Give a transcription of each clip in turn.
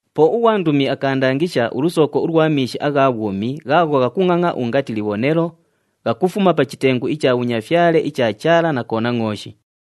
Po ughwandumi akaandangisha ulusooko ulwa miishi agha bhwumi ghaagho ghakungʼangʼa ungati libhonelo, ghakufuma pa chitengu icha bhunyafyale icha Chaala na Konangʼooshi.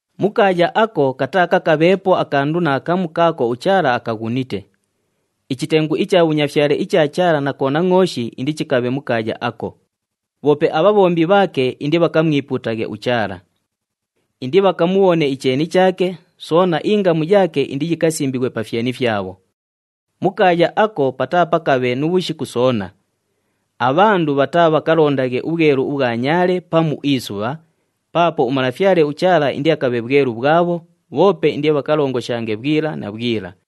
Mu kaaya ako kataakakabheepo akandu naakamu kaako uChaala akaghunite. Ichitengu icha bhunyafyale icha Chaala na Konangʼooshi indichikabhe mu kaaya ako, bhoope abhabhombi bhaake indibhakamwipuutaghe uChaala. Indibhakamubhone icheeni chaake, soona ingamu yaake indiyikasimbighwe pa fyeni fyabho. Mu kaaya ako pataapakabhe nu bhushiku soona. Abhandu bhataabhakalondaghe ubhwelu ubhwa nyaale pamu isubha, paapo uMalafyale uChaala indiakabhe bhwelu bhwabho, bhoope indibhakalongoshange bhwila na bhwila.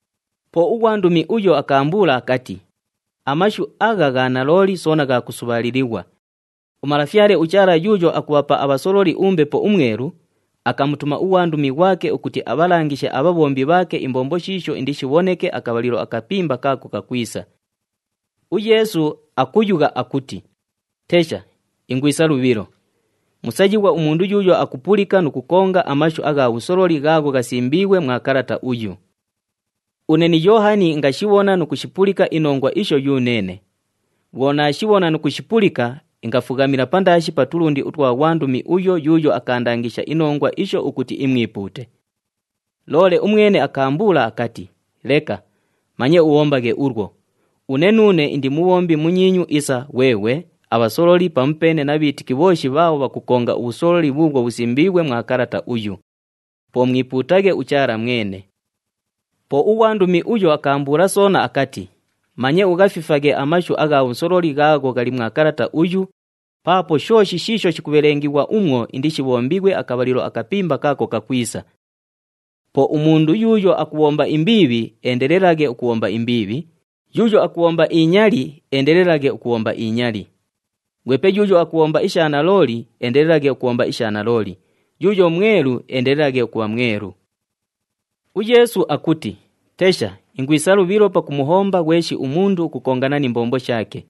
Po ughwandumi uyo akaambuula akati, “Amashu agha gha nalooli soona gha kusubhaalilighwa. UMalafyale uChaala yuuyo akubhapa abhasololi uMbepo uMwelu, akamutuma ughwandumi ghwake ukuti abhalangishe abhabhombi bhaake imbombo shiisho indishibhoneke akabhalilo akapimba kaako kakwisa.” UYeesu akuyugha akuti, “Tesha! Ingwisa lubhilo. Musayighwa umundu yuuyo akupulika nu kukonga amashu agha bhusololi ghaagho ghasimbiighwe mwa kalata uyu.” Une ni Yoohani ingashibhona nu kushipulika inongwa isho yuneene. Bhwo naashibhona nu kushipulika, ingafughamila pandaashi pa tulundi utwa ghwandumi uyo yuuyo akaandangisha inongwa isho ukuti imwipuute. Loole umwene akaambuula akati, “Leka! Manye ubhombaghe ulwo! Une nuune indi mubhombi munyiinyu isa ghweghwe, abhasololi pamupeene na bhiitiki bhooshi bhaabho bhakukonga ubhusololi bhuubhwo bhusimbiighwe mwa kalata uyu. Po mwipuutaghe uChaala mwene!” Po ughwandumi uyo akaambuula soona akati, “Manye ughafifaghe amashu agha bhusololi ghaagho ghali mwa kalata uyu, paapo shooshi shiisho shikubhelengighwa umwo indishibhombighwe akabhalilo akapimba kaako kakwisa. Po umundu yuuyo akubhomba imbiibhi, eendelelaghe ukubhomba imbiibhi, yuuyo akubhomba inyali, eendelelaghe ukubhomba inyali. Ghwepe yuuyo akubhomba isha nalooli, eendelelaghe ukubhomba isha nalooli, yuuyo mwelu, eendelelaghe ukubha mwelu.” UYeesu akuti, “Tesha! Ingwisa lubhilo pakumuhomba ghweshi umundu ukukongana ni mbombo shaake.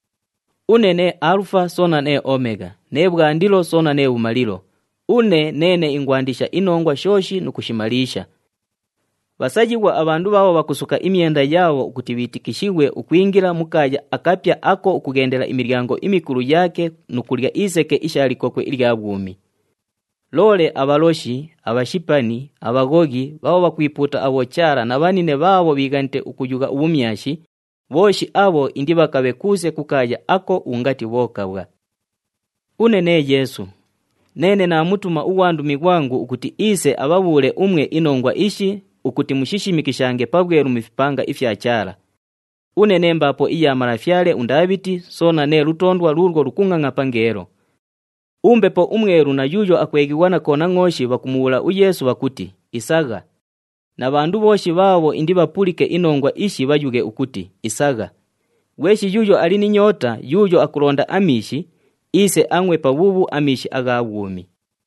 Une nee Aalufa soona nee Omegha, nee Bhwandilo soona nee Bhumalilo, une neene ingwandisha inongwa shooshi nu kushimaliisha.” Bhasayighwa abhandu bhaabho bhakusuka imyenda yaabho ukuti bhiitikishighwe ukwingila mu kaaya akapya ako ukughendela imilyango imikulu yaake nu kulya iseke isha likokwe ilya bhwumi. Loole abhaloshi, abhashipani, abhaghoghi, bhaabho bhakwipuuta abhochaala na bhanine bhaabho bhiighanite ukuyugha ubhumyashi, bhooshi abho indibhakabhe kuuse ku kaaya ako ungati bhokabhwa. “Une nee Yeesu, neene naamutuma ughwandumi ghwangu ukuti iise abhabhuule umwe inongwa ishi ukuti mushishimikishange pabhwelu mu fipanga ifya Chaala. Une nee mbaapo iya malafyale uNdaabhiti, soona nee lutoondwa luulwo lukungʼangʼa pangeelo.” UMbepo uMwelu na yuuyo akweghighwa na Konangʼooshi bhakumubhuula uYeesu bhakuti, “Isagha!” Na bhandu bhooshi bhaabho indibhapulike inongwa ishi bhayughe ukuti, “Isagha!” Ghweshi yuuyo ali ni nyoota, yuuyo akulonda amiishi, iise angʼwe pabhuubhu amiishi agha bhwumi.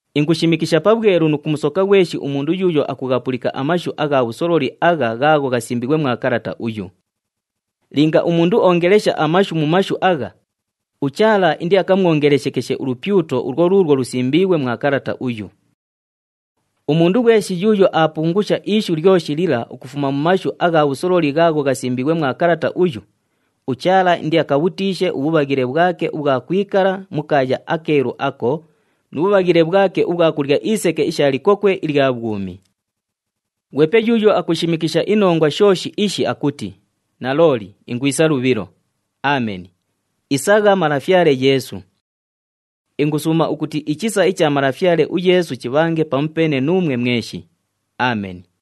Ingushimikisha pabhwelu nu kumusoka ghweshi umundu yuuyo akughapulika amashu agha bhusololi agha ghaagho ghasimbiighwe mwa kalata uyu. Linga umundu oongelesha amashu mu mashu agha, uChaala indiakamwongeleshekeshe ulupyuto ulwo luulwo lusimbiighwe mwa kalata uyu. Umundu ghweshi yuuyo aapungusha ishu lyoshi lila ukufuma mu mashu agha bhusololi ghaagho ghasimbiighwe mwa kalata uyu, uChaala indiakabhutiishe ubhubhaghile bhwake ubhwa kwikala mu kaaya akeelu ako, nu bhubhaghile bhwake ubhwa kulya iseke isha likokwe ilya bhwumi. Ghwepe yuuyo akushimikisha inongwa shooshi ishi akuti, “Nalooli, ingwisa lubhilo!” Ameni. Isagha Malafyale Yeesu! Ingusuuma ukuti ichisa icha Malafyale uYeesu chibhange pamupeene nuumwe mweshi. Ameni.